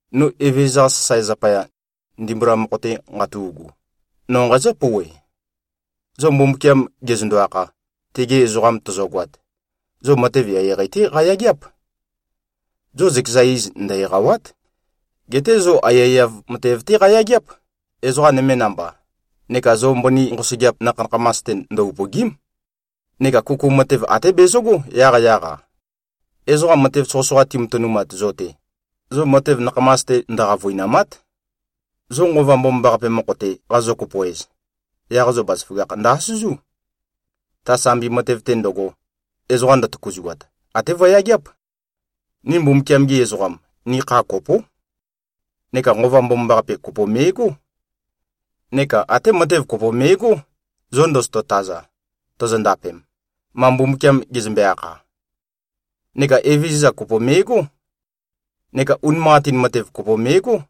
No Evezøza-qa sasae zapaya, ndimbula mokho-te nqatu꞉gu, no nqazǿ-pouwe: Zo Mbumbukiam gezøndo-akha, tegi ezoqam tozogoat, zo matev eqeieqei-té qayageáp. Zo zøkeza iz ndø-eqàwa᷄t. Geté zo aiyaiyav matev-té qayageáp, ezoqa nøme namba, neka zo mbøni nqosøgeap nakha-nakhamas-te ndø-upø̀gi᷄m. Neka kuku matev até bezøgó yaqyaq-a. Ezoqa matev soqøsoqa timatønumat zo-te, zo matev nakhamas-te ndø-qavøinàma᷄t. Zo Nqova Mbomambaqape mokho-te qazo-kopo-ez, yaq zo bazaføgakh ndø-asøzú. Ta sambi matev-te ndøgo, ezoqa ndøtøkuzuat, até vøyageáp. Ni Mbumbukiam-gi ezoqam, ni kha kopó. Neka Nqova Mbomambaqape kopo me꞉gó. Neka até matev kopo me꞉gó, zo ndozoto-taza, tozondapem, ma Mbumbukiam gezømbe-akha. Neka Evezøza kopo me꞉gó. Neka unimanqatin matev kopo me꞉gó.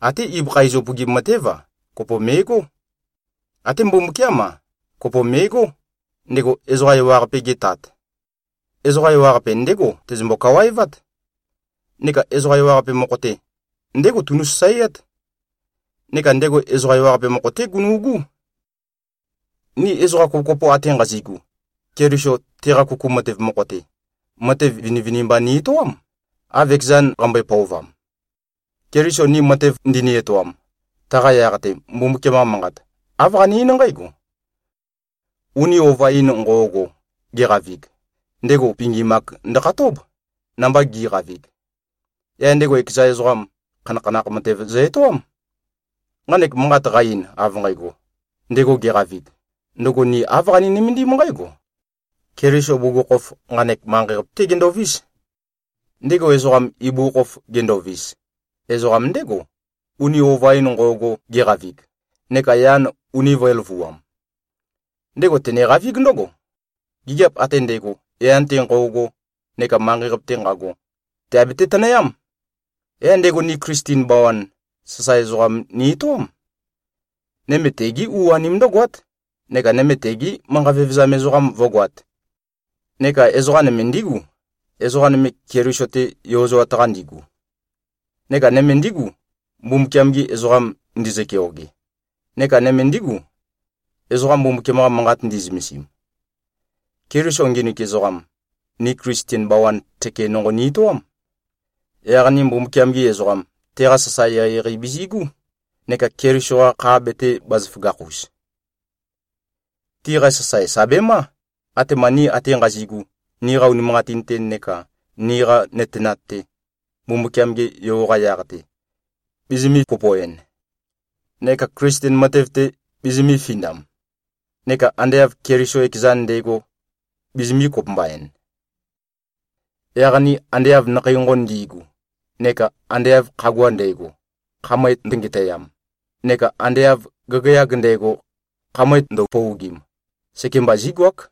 Até ibøkha iz upøgim matév-a, kopo me꞉gó. Até Mbumbukiám-a, kopo me꞉gó, ndego ezoqa ewaqape-ge Tat. Ezoqa ewaqape, ndégo tezømbo-kawaevát. Neka ezoqa ewaqape mokho-te, ndégo tunu꞉-sasaeát. Neka ndego ezoqa ewaqape mokho-té gunu꞉gú. Ni ezoqa kopokopo ate nqazi꞉gu, Keliso teqa kuku matev mokho-te, matev vinivinimba ni-etoám, av ekezan qambøe-pøovam. Keliso ni matev ndini-etoam, taqa yaq-te Mbumbukiam-qa Manqat, āv qane-eín nqǽgo: “Uni ova-in nqo꞉go geqavig, ndego pingim-ak ndøkhatób, namba gi꞉qavig. Yaq ndego ekeza ezoqam, khanakhanakh matev zø-etoám.” Nqanek manqat qa-ein, av nqægo, “ndego geqavig,” ndøgo ni āv qani-nømendím nqǽgo: Keliso bugukhokhof, nqanek manqei-qape-té gendovís. Ndego ezoqam, ibugukhokhof gendovis, ezoqam ndégo, uni ova-in nqo꞉go geqavig, neka yan uni vø̄e-løvuam. Ndego teneqavíg ndǿgo: Gigiap ate ndægo, yan-te nqo꞉go neka manqei-qape-te nqago, tèabete-tønøyám. Yaq ndego ni Klisten bawan, sasae ezoqam ni-etoám. Nøme tegí u-anim ndǿgoát, neka nøme tegi manqa vevezam ezoqam vǿgoāt. Neka ezoqa nøme ndígu, ezoqa nøme Keliso-te yozoat-qa ndigu. Neka nøme ndígu, Mbumbukiam-gi ezoqam ndizø-keoge. Neka nøme ndígu, ezoqa Mbumbukiam-qa Manqat ndi꞉zømesim. Keliso nginik ezoqam, ni Klisten bawan tøke nonqo ni-etoám. Yaq ni Mbumbukiam-gi ezoqam, teqa sasae eqeieqei bizi꞉gú, neka Keliso-qa kha betē-bazaføgakh-us. Tiqa sasae, sà bemá, atema ni ate nqazi꞉gu, niqa unimanqatin-te neka niqa nøtenat-te, Mbumbukiam-ge Yo-qa yaq-te, bizimī-kopo-en, neka Klisten matev-te bizimī-findam neka ande av Keliso ekezan nde꞉go, bizimī-kopømba-en. Yaq ni ande av nakhei nqonqon ndi꞉gu, neka ande av khagua ndægo, khamøe ndøngetøyam, neka ande av gagayag ndægo, khamøe ndøpøogim, sekembá zígoák,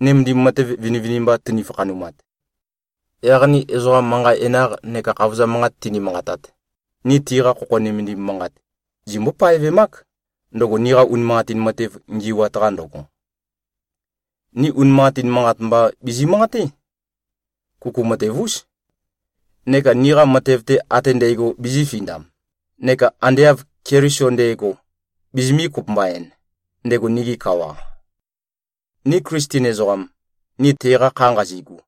nømendim matev vinivinimba tøni-fakhanumat. Yaq ni ezoqa manqa enaq neka khavozam manqat tini-manqatat, ni tiqa khokho nømendim manqat zimømbó-paevemák, ndøgo niqa unimanqatin matev ngi꞉wat-qa ndøgo. Ni unimanqatin manqat mba bizi-manqaté. Kuku matev-ús. Neka niqa matev-te ate ndægo bizīfindam, neka ande av Keliso nde꞉go, bizimī-kopømba-en, ndego nigi kawa. Ni Klisten ezoqam, ni teqa kha nqazigu,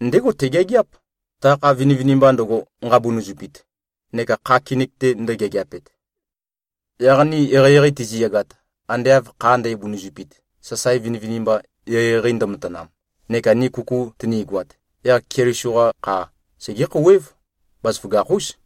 ndégo tegeageáp, ta kha vinivinimba ndøgo, nqabunuzupit neka kha kinik-te ndøgeageapet. Yaq ni eqeieqei tiziyagat, ande av kha ndæbunuzupit, sasae vinivinimba eqeieqei ndømatanam, neka ni kuku tønigoat, yaq Keliso-qa kha segé-khouwév, bazaføgakh-ús.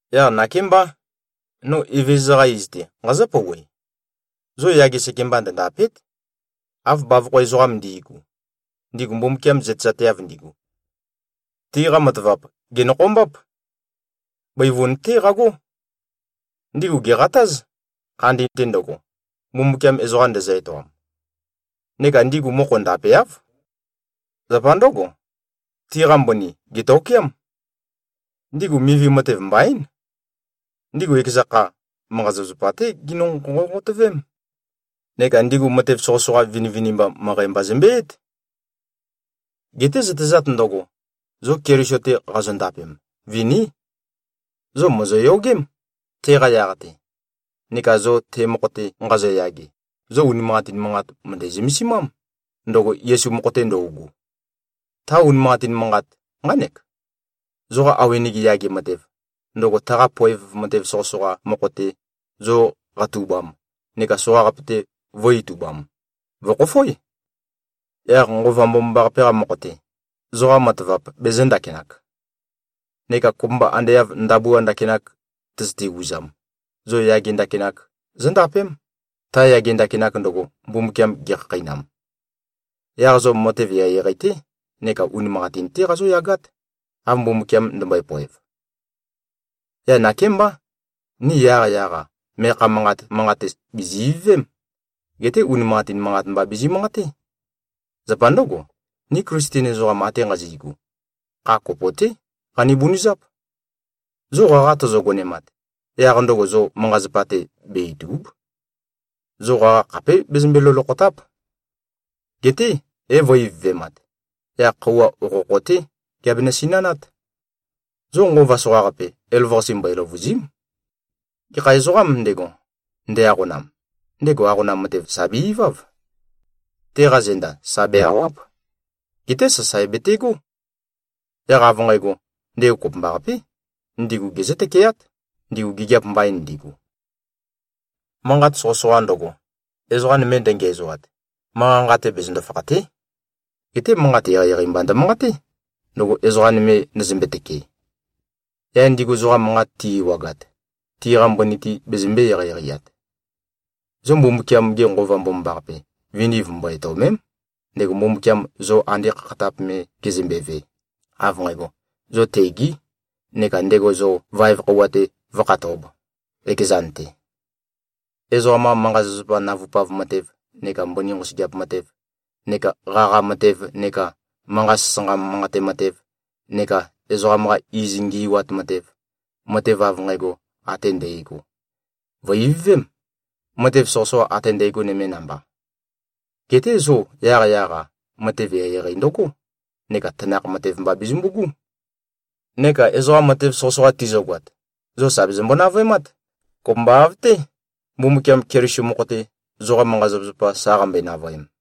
Yaq nakémbá, no Evezøza-qa iz-te nqazǿ-pouwe: Zo yage sekemba ndøndàpe᷄t, av bavokho ezoqam ndi꞉gu, ndigu Mbumbukiam zøtezateav ndigu. Tiqa matavap, gènokhombáp. Bøivun-té qagó. Ndigu gèqatáz, khandi-te ndøgo, Mbumbukiam ezoqa ndezø-etoam. Neka ndigu mokho ndapeáv. Zapa ndǿgo, tiqa mbøni gètokeám. Ndigu mivi matev mbaín. Ndigu ekeza kha, manqa-zapazapa-té ginø-nqonqotøvém. Neka ndigu matev soqøsoqa vinivinimba møqæ mba zømbeyǽt. Geté zøtezat ndøgo, zo Keliso-te qazondapem, viní! Zo mòzoyogém, teqa yaq-te, neka zo te mokho-te nqazoyage, zo unimanqatin manqat, mø̀ndæ-zømesimám, ndøgo Yesu mokho-te ndøugu. Ta unimanqatin manqat, nqánek: Zoqa awenege yage matev, ndøgo taqa poev matev soqøsoqa mokho-te zo qatubam neka soqaqape-te vø̄-itubam, vø̀khofoé. Yaq Nqova Mbomambaqape-qa mokho-te, zoqa matavap bezø̄-ndakinak. Neka kopømba ande av ndabua ndakinak tøzøte-uzam, zo yage ndakinak zóndapém, ta yage ndakinak ndøgo, Mbumbukiam gekhakheinam. Yaq zo matev eqeieqei-té neka unimanqatin-té qazóyagát, av Mbumbukiam ndømbøe-poev. Yaq nakémbá, ni yaqyaq-a meakha manqat manqate bìzi-ivøvém. Geté unimanqatin manqat mba bizi-manqaté. Zapa ndǿgo, ni Klisten ezoqam ate nqazi꞉gu, kha kopo-té qani-bunøzáp. Zo qaqa tozo-gonemat, yaq ndøgo zo manqa-zapa-te be-ìtu᷄b. Zo qaqa khapé bezømbe-lolokhòta᷄p. Geté é-vø̄-ivøvemat. Yaq khøuwa okhokho-té geabemø-sinanát. Zo nqova soqaqape, elavøqase mbøe-løvùzi᷄m. Gekha ezoqām ndego, nde-aqonam, ndego aqonam matev, sà be-iváv. Teqa zenda sa be-àwa᷄p. Geté sasae betegó. Yaq av nqægo, ndego kopømbaqapé, ndigu gezǿ-tøkeát, ndigu gigiap mbain ndigu. Manqat soqøsoqa ndøgo, ezoqa nøme ndøngiæzoat, manqa-nqa-te bezøndo-fakhàte᷄. Geté manqat eqeieqei mba ndømanqaté, ndøgo ezoqa nøme ndøzømbe-tøkee. Yaq ndigu zoqa manqat ti꞉-ewagat, tiqa mbøni-te bezømbē-eqeieqeiat. Zo Mbumbukiam-ge Nqova Mbomambaqape, viniv mbo-etøòme᷄m, ndego Mbumbukiam zo ande khakhatap me gezømbeve, av nqægo, zo tegē, neka ndego zo vaev khøuwa-te vǿkhatōb, ekezan-te. Ezoqam-qa manqa-zapazapa navupav matev neka mbøni nqosøgeap matev neka qaqa matev neka manqa sasanqa manqate matev neka ezoqam-qa iz ngi꞉wat matev, matev av nqægo ate ndægo, vø̀-ivøvém, matev soqøsoqa ate ndægo nøme namba. Geté zo yaqyaq-a, matev eqeieqei ndøgó neka tanakh matev mba bezømbu꞉gú. Neka ezoqa matev soqøsoqa tizøgoat, zo sà bezømbo-navøemát, kopømba av-té, Mbumbukiam Keliso mokho-te, zoqa manqa-zapazapa sa qambøe-navøem.